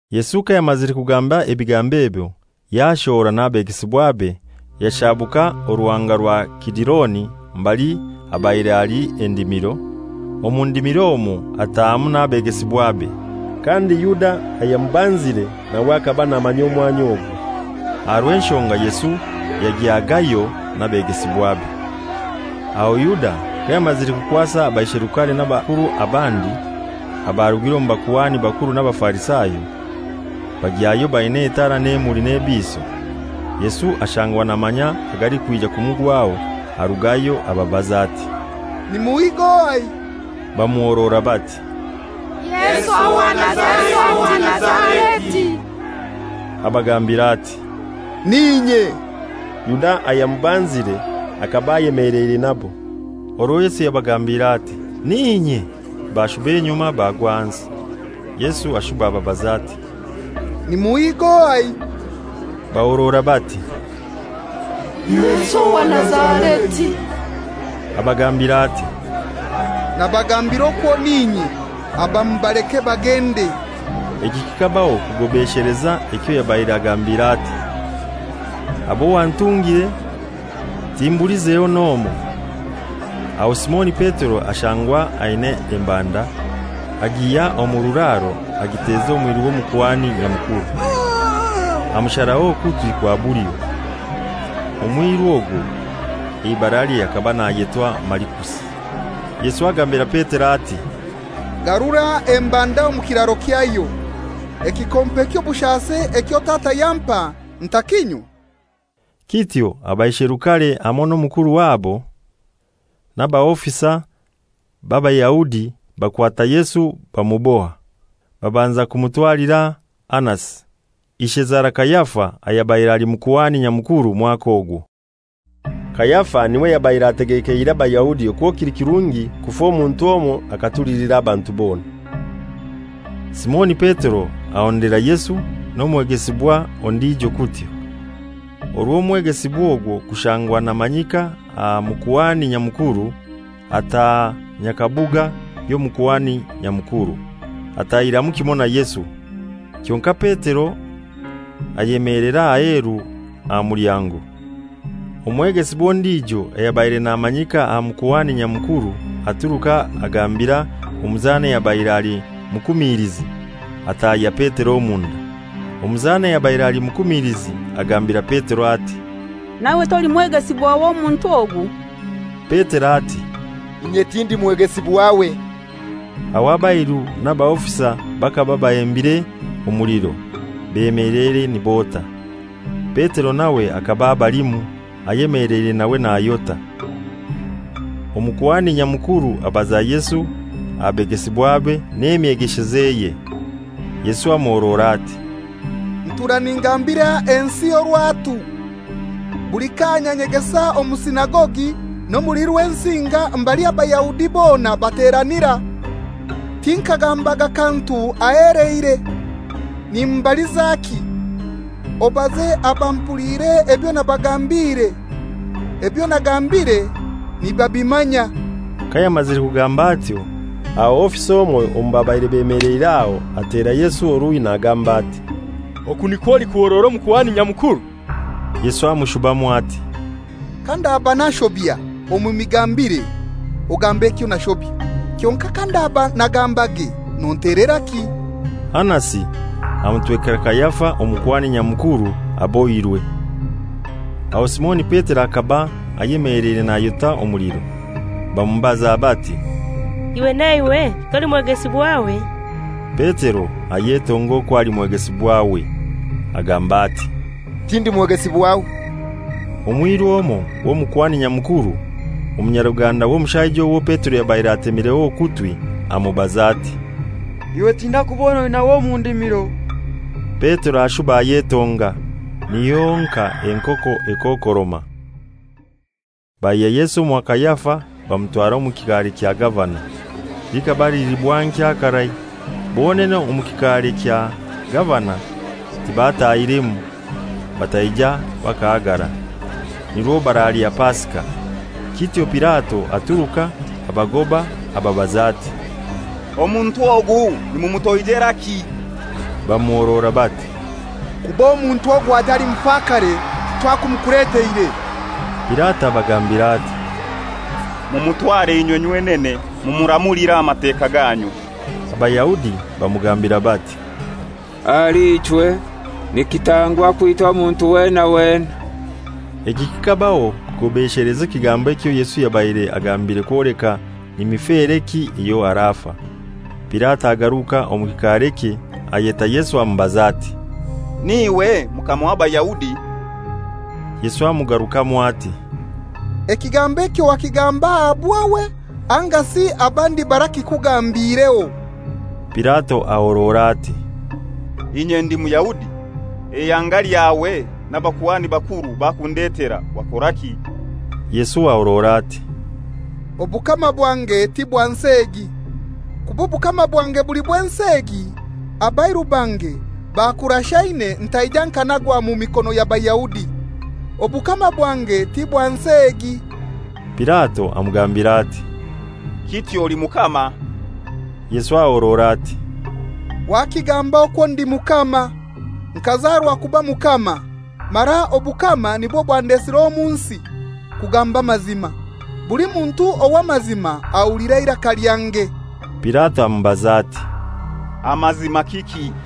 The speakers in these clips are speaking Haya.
Yesu kayamazire kugamba ebigambo ebyo, yashohora n'abegesibwabe, yashabuka Oruhanga rwa Kidironi mbali habaire hali endimiro, omu ndimiro omwo atahamu n'abegesibwabe. Kandi Yuda ayamubanzire nawe hakaba namanya omwanya ogwo, aha rw'enshonga Yesu yagyagayo n'abegesibwabe. Aho Yuda kayamazire kukwasa abaisherukare n'abakuru abandi abarugire omu bakuhani bakuru n'Abafarisayo, bagyayo baina etara n'emuli n'ebiiso. Yesu ashangwa namanya agalikwija kumugwaho, arugayo ababaza ati, «Nimuhiiga ohai?» Bamuhorora bati, «Yesu owa Nazareti.» Abagambira ati, «N'inye.» Yuda ayamubanzire hakaba ayemeleire nabo. Orwo Yesu yabagambiire ati, «N'inye,» bashuba enyuma bagwa ahansi. Yesu ashuba ababaza ati, «Nimuhiiga ohai?» Bahorora bati, «Yesu owa Nazareti.» Abagambira ati, «Nabagambira okwo n'inye, aba mubaleke bagende.» Eki kikabaho kugobesheleza ekyo yabaire agambire ati, «Abo wantungire timbulizeho n'omoi.» Aho Simoni Petero ashangwa aina embanda, agihya omu kiraro agiteza omwiru w'Omukuhani Nyamukuru amusharaho okutwi kwa bulyo. Omwiru ogwo eibaralye hakaba nayetwa Malikusi. Yesu agambira Petero ati, «Garura embanda omu kiraro kyayo, ekikompe ky'obushasi ekyo Tata yampa ntakinywa?» Kityo abaisherukare hamoi na mukuru wabo n'abaofisa b'Abayahudi bakwata Yesu bamuboha. Babanza bamutwalira Anasi, ishezara Kayafa ayabaire ali Mukuhani Nyamukuru mwaka ogwo. Kayafa n'iwe yabaire ategekeire Abayahudi okwo kili kirungi kufa omuntu omoi akatulilira abantu bona. Simoni Petero ahondera Yesu, n'omwegesibwa ondijo kutyo. Orwo omwegesibwa ogwo kushangwa namanyika aha Mukuhani Nyamukuru, ataaha nyakabuga y'Omukuhani Nyakumuru, atahiramu kimoi na Yesu. Kyonkai Petero ayemeelera aheru aha mulyango. Omwegesibwa ondijo ayabaire namanyika aha Mukuhani Nyamukuru, aturuka agambira omuzana ayabaire ali mukumilizi, atahya Petero omunda. Omuzana ayabaire ali mukumilizi agambira Petero ati, «Naiwe toli mwegesibwa w'omuntu ogu?» Petero ati, «Inye tindi mwegesibwawe.» Aho abairu n'abaofisa bakaba bahembire omuliro, beemeleire nibota. Petero nawe hakaba abalimu, ayemeleire nawe nayota. Omukuhani Nyamukuru abaza Yesu aha begesibwabe n'emyegeshezeye. Yesu amuhorora ati, «Ntuura ningambira ensi orwatu; buli kaanya nyegesa omu sinagogi n'omuli Rwensinga mbali Abayahudi bona bateranira; tinkagambaga kantu aheheleire. Nombalizaki? Obaze abampuliire ebyo nabagambiire; ebyo nagambire nibabimanya.» Kayamazire kugamba atyo, aho ofisa omoi omu babaire bemeleire aho atera Yesu oruhi nagamba ati, «Oku nikwo olikuhorora Omukuhani Nyamukuru?» Yesu amushubamu ati, «Kandaba nashobya omu migambire, ogambe ekyo nashobya; kyonkai kandaba nagambage nonteleraki?» Anasi amutwekera Kayafa Omukuhani Nyamukuru abohirwe. Aho Simoni Petero hakaba ayemeleire nayota omuliro. Bamubaza bati, «Iwe naiwe toli mwegesibwawe?» Petero ayetonga okwo ali mwegesibwawe, agamba ati, «Tindi mwegesibwawe.» Omwiru omoi w'Omukuhani Nyamukuru, omunyaruganda w'omushaija owo Petero yabaire atemireho okutwi, amubaza ati, «Iwe tinaikubona oinawe omu ndimiro?» Petero ashuba ayetonga; niho honkai enkoko ekookoroma. Baihya Yesu omwa Kayafa bamutwara omu kikaare kya gavana. Likaba lili bwankya karai. Bonene omu kikaare kya gavana tibatahiremu, bataija bakahagara, nirwo baralya Pasika. Kityo Pilato aturuka abagoba, ababaza ati, «Omuntu ogu nimumutoijeraki?» Bamuhorora bati, «Kuba omuntu ogu atali mufakare titwakumukuleteire.» Pilato abagambira ati, «Mumutware inywe nywenene mumuramulire aha Mateka ganyu.» Abayahudi bamugambira bati, «Ahali ichwe nikitangwa kwita omuntu wena wena.» Eki kikabaho kugobesheleza ekigambo ekyo Yesu yabaire agambire kwoleka ni mifereki eyo arafa. Pilato agaruka omu kikaarekye, ayeta Yesu amubaza ati, «N'iwe Mukama w'Abayahudi?» Yesu amugarukamu ati, «Ekigambo ekyo wakigamba aha bwawe angasi abandi barakikugambiireho?» Pilato ahorora ati, «Inye ndi Muyahudi? Eihanga lyawe n'abakuhani bakuru bakundetera; wakoraki?» Yesu ahorora ati, «Obukama bwange ti bwa nsi egi. Kuba obukama bwange buli bw'ensi egi, abairu bange bakurashaine ntaija nkanagwa omu mikono y'Abayahudi. Obukama bwange ti bwa nsi egi.» Pilato amugambira ati, «Kityo oli mukama?» Yesu ahorora ati, «Wakigamba okwo ndi mukama. Nkazarwa kuba mukama, mara obukama nibwo bwandesire omu nsi, kugamba amazima. Buli muntu ow'amazima ahulira eiraka lyange.» Pilato amubaza ati, «Amazima kiki?»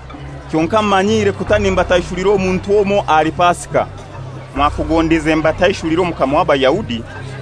Kyonkai mumanyiire kuta nimbataishulira omuntu omoi ahali Pasika. Mwakugondize mbataishulire Omukama w'Abayahudi?»